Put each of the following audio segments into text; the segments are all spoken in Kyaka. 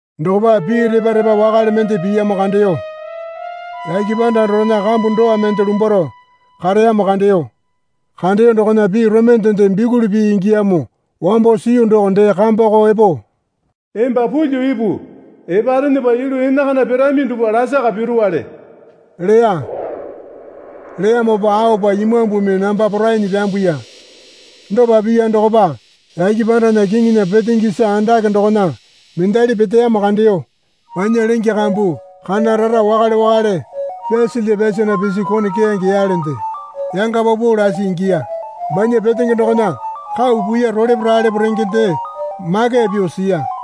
Dokopa pii repa repa wakale mende piyamo kandeyo. Yake panda dorena kambu dowa mende lumbwaro kareyamo kandeyo. Kandeyo dokona pii romende bikuli pii ingiyamo wamba siyu doko dee kambako epo, Emba pulyuo ipu. Eparenepa yulu enakana pirami dupwa lasaka piruwale leya. Leyamopa aopa Imambumi namba porainyi pyambuya. Dopa piya dokopa yake pandana kiŋinya petenge isa andake dokona mendali peteyamo kandeyo. Banya lenge kambu kana rara wakale wakale pyasalya pyasana pisi kone keyange yalende yanga paupau lasi ingiya. Banya petenge dokona kau puiya rolepo ralepo rengende makeya pyuo siya.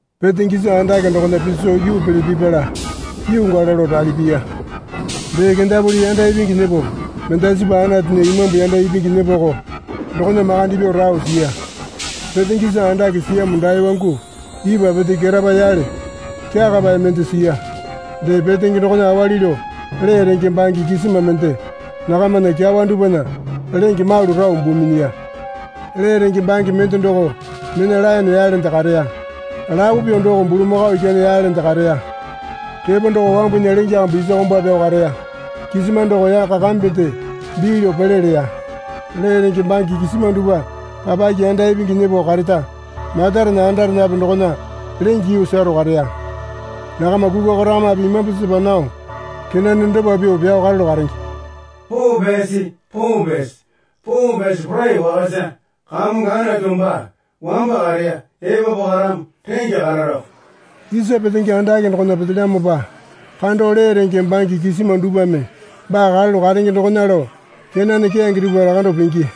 Petenge isa andake dokona piso yuu pele pipala yuu gala lao rali piya. Dee kendapuli yanda ipingi nyepo mendasipa Anatunya imambu yanda ipingi nyepoko dokona makande pyuo rao siya. Petenge isa andake siyamo dae wangu ipwa pete ketapa yale kyakapae mende siya. Dee petenge dokona awali lao lee renge bange kisima mende nakamana kyawa dupwana lenge malu rao buu minyiya. Lee renge bange mende doko mena laene yalende kareya. Lapo pyuo doko bulamakao ikyane yalende kareya. Repo doko wambunya lenge kambu isa komba pyao kareya. Kisima doko yaka kambende bii lao pele leya. Lee renge bange kisima dupwa papake yanda ipingi nyepo kareta matarena andarenape dokona lenge yuu sero kareya. Nakama kukwa korakamape imambu sepa nao kenane dopa pyuo pyao karalu karenge. Poo pyasi, poo pyasi, poo pyasi Porai Wakasa Kamongo Anatu baa wamba kareya epapu karamo rengya kararako. Isa petenge andake dokona petelyamopa kando lee renge bange kisima dupwame baa karalu karenge dokona lao kenane keyange dupwa lakandao pingi.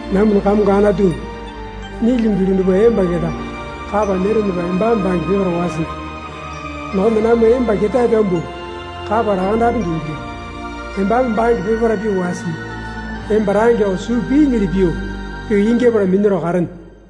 Namwana Kamongo Anatu, nyilyingi yulu dupwa emba keta kapa nyerenepa embame bange peparae wasingi. Dokona namwa emba ketae pyambuo kapa lakandapenge ingilyamo. Embame bange peparae pyuo wasii. Emba rangeko suu piinyili pyuo pyuo ingyapala minyaro karene.